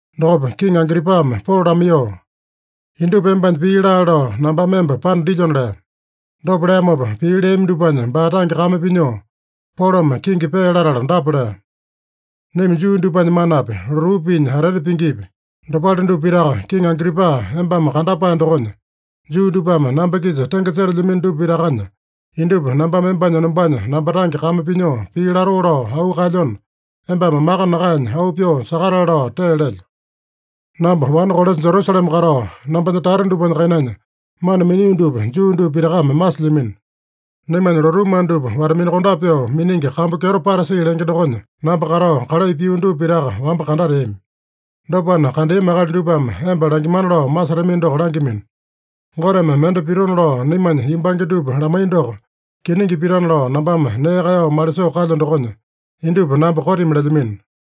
Dokopa Kiŋi Agripame Polo lamaiyoo, “Indupa embanya pii laale lao nambame emba panda dilyona” lea. Dopa leamopa, pii leami dupanya baa tange kame pinyoo, Polome kingi pee latala dapa lea: “Naima Juu dupanya manapi, lotuu piinya atete pingipi, dopale dupa pitaka, Kiŋi Agripa, embame kandapae dokonya, Juu dupame namba-kisa tenge setelyamino dupa pitakanya indupa nambame embanya enombanya namba tange kame pinyoo pii latoo lao auu kaelyona, embame maka nakaenya, auu pyoo sakatale lao tee lelyo. “Namba wane kolesa Jerusalema katao, nambanya tata dupanya kainanya mana minio dupa Juu dupa pitakame masilyamino. Naimanya lotuu mana dupa wata-minakondape pyoo miningi kambu kyeto Parasi lenge dokonya namba katao, kalai pio dupa pitaka wamba kandateami. Dopana, kandeami akali dupame emba langimana lao masetamino doko langyamino. Goteme mende pitona lao naimanya yumbange dupa lamaiya doko kiningi pitana lao nambame nee kaeyao malisoo kalyo dokonya, indupa namba kotimi lelyamino.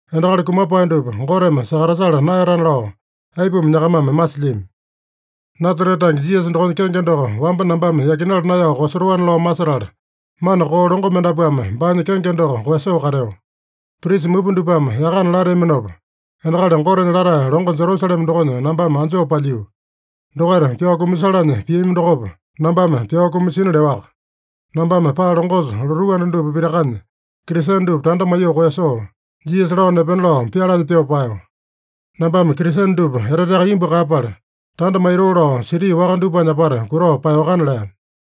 Endakali kumapae dupa Goteme sakatasala naeyatana lao aipuma nyakamame masilyami? “Nasarete tange Jisasa dokonya kenge doko wamba nambame yakinala naeyao koeyasotoana lao masetala, mana koo longo mendapuame baanya kenge doko koeyasoo kateo. Prisa mupa dupame yakana lateaminopa, endakali Gotenya latae longo Jerusalema dokonya nambame anjoo palyiu. Dokaita pyao kumasalanya piami dokopa, nambame pyao kumasina leowaka. Nambame paa longosa lotuu anda dupa pitakanya Kristene dupa tanda maiyoo koeyasoo, Jisasa lao nepena lao pyalanya pyoo paeyo. Nambame Kristene dupa eteteaka imbu kaeyapala, tanda maitoo lao siti waka dupanya apata kutao paeyoakana” lea.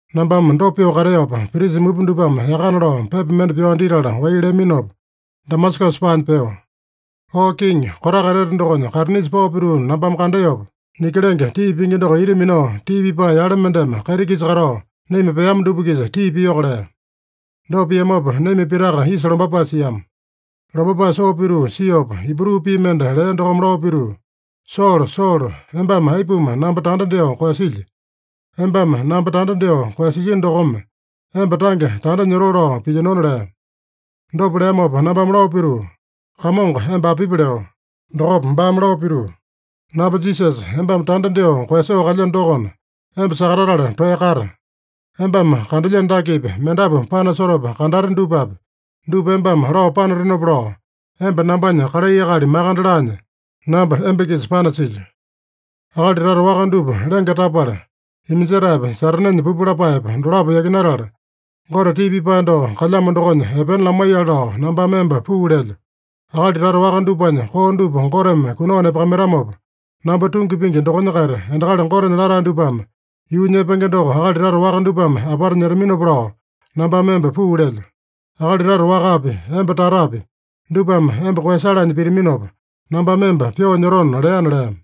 “Nambame dopa pyoo kateopa, prisa mupa dupame yakana lao pepa mende pyao ditala wai leaminopa, Damasakasa paanya peo. Oo kiŋi, kotaka etete dokonya kaitinisa pao pituu nambame kandeopa, niki lenge tii pingi doko ita minao tii pipae yale mendeme kaiti-kisa katao, naima peama dupa-kisa tii piyoko lea. Dopa piamopa, naima pitaka isa lombapae siama. Lombapae soo pituu siopa, Ibru pii mende lea dokome lao pituu, ‘Solo, Solo, embame aipuma namba tanda dyoo koeyasilyi? Embame namba tanda dyoo koeyasilyino dokome, emba tange tanda nyotoo lao pilyinona’ lea. Dopa leamopa nambame lao pituu, ‘Kamongo, emba apipi?’ leo. Dokopa baame lao pituu, ‘Namba Jisasa, embame tanda dyoo koeyasoo kalyeno dokona, emba sakatatala toeya kata. Embame kandelyeno dakepi, mendapu panasotopa kandate dupapi, dupa embame lao panatenopa lao, emba nambanya kalai akali makande laanya, namba emba-kisa panasilyo. Akali tata waka dupa lenge tapala, iminjetaepa Satanenya pupu lapaepa dolapo yakinatala, Gote tii pipae doko kalyamo dokonya epena lamaiyale lao nambame emba puu lelyo. Akali tata waka dupanya koo dupa Goteme kunao nepakamaitamopa, namba tungi pingi dokonya-kaita, endakali Gotenya latae dupame yuu nyepenge doko akali tata waka dupame apata nyetaminopa lao nambame emba puu lelyo. Akali tata wakapi, emba tatapi, dupame emba koeyasalanya pitaminopa, nambame emba pyoo nyotona’ leana” lea.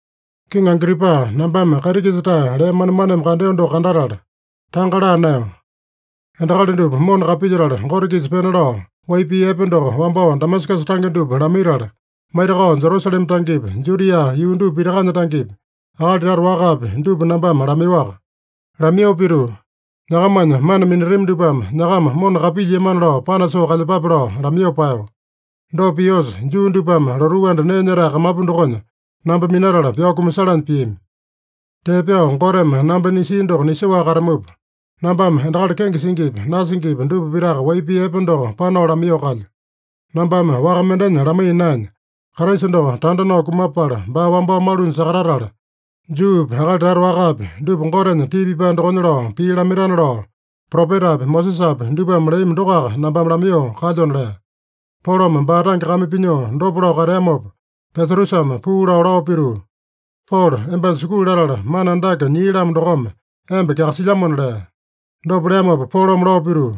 “Kiŋi Agripa, nambame kaiti-kisa-tae lee manemaneme kandeo doko kandatala, tanga laa naeyo. Endakali dupa mona kapilyetala, Gote-kisa pena lao wai pii epe doko, wambao Damasakasa tange dupa lamaitala, maitakao Jerusalema tangepi, Judia yuu dupa pitakanya tangepi, akali tata wakapi, dupa nambame lamaiyoaka. Lamaiyoo pituu, ‘Nyakamanya mana minatami dupame nyakama mona kapilyiamana lao panasoo kalyepape’ lao lamaiyoo paeyo. Dopa piosa, Juu dupame lotuu anda nee nyetae kamapu dokonya namba minatala pyao kumasalanya piami. Tee pyao Goteme namba nisia doko nisoaka katamupa, nambame endakali kenge singipi, nasingipi dupa pitaka wai pii epe doko panao lamaiyoo kalyo. Nambame waka mendenya lamaiya naenya, Kraisa doko tanda nao kumapala, baa wambao malunya sakatatala, Juupi akali tata wakapi dupa Gotenya tii pipae dokonya lao pii lamaitana lao, propetapi Mosesapi dupame leami dokoaka nambame lamaiyoo kalyona” lea. Polome baa tange kame pinyoo dopa lao kateamopa Pesatusame puu lao, lao pituu, “Polo, embanya sukulu latala mana andake nyii-lamo dokome emba kyakasilyamona” lea. Dopa leamopa Polome lao pituu,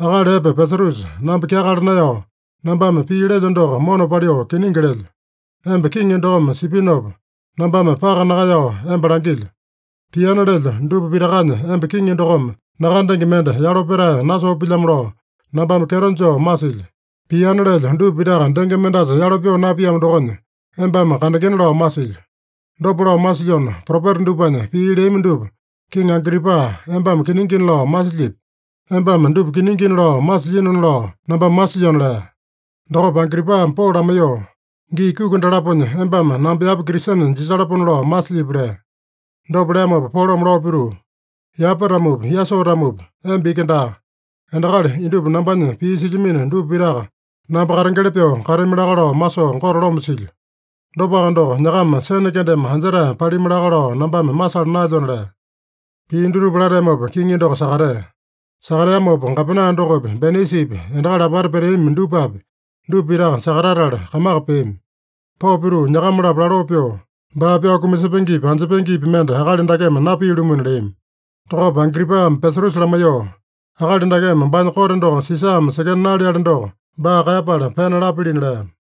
“Akali epe Pesatusa, namba kyakala naeyao, nambame pii lelyo doko mona paliu kiningi lelyo. Emba kiŋi dokome sipinopa, nambame paka nakaeyao emba langilyo: Piana lelyo dupa pitakanya emba kiŋi dokome nakandenge mende yalo petae nasoo pilyamo lao nambame kyeto joo masilyo. Piana lelyo dupa pitaka denge mendasa yalo pyoo napiamo dokonya, embame kandengena lao masilyo. Dopa lao masilyona, propeta dupanya pii leami dupa, Kiŋi Agripa, embame kiningina lao masilyipi? Embame dupa kiningina lao masilyinona lao nambame masilyona” lea. Dokopa Agripame Polo lamaiyoo, “Gii kuki dalaponya embame namba yapa Kristene jisalapona lao masilyipi?” lea. Dopa leamopa Polome lao pituu, “Yapa-tamopi, yasoo-tamopi, emba iki daa, endakali indupa nambanya pii silyamino dupa pitaka namba katengeli pyoo katami laka lao masoo Gote loma silyo. Dopaka doko, nyakama sene kendeme anjetae palimi laka lao nambame masala naelyona” lea. Pii dutupa lateamopa kiŋi doko sakatea. Sakateamopa gapena dokopi, Benaisipi, endakali apata peteami dupapi, dupa pitaka sakatatala kamaka peami. Pao pituu nyakama-lapo laloo pyoo, “Baa pyao kumasepengepi, anjepengepi mende akali dakeme napia-lumuna” leami. Dokopa Agripame Pesatusa lamaiyoo, “Akali dakeme baanya kote doko Sisame sekena naleali doko, baa kaeyapala pena lapilina” lea.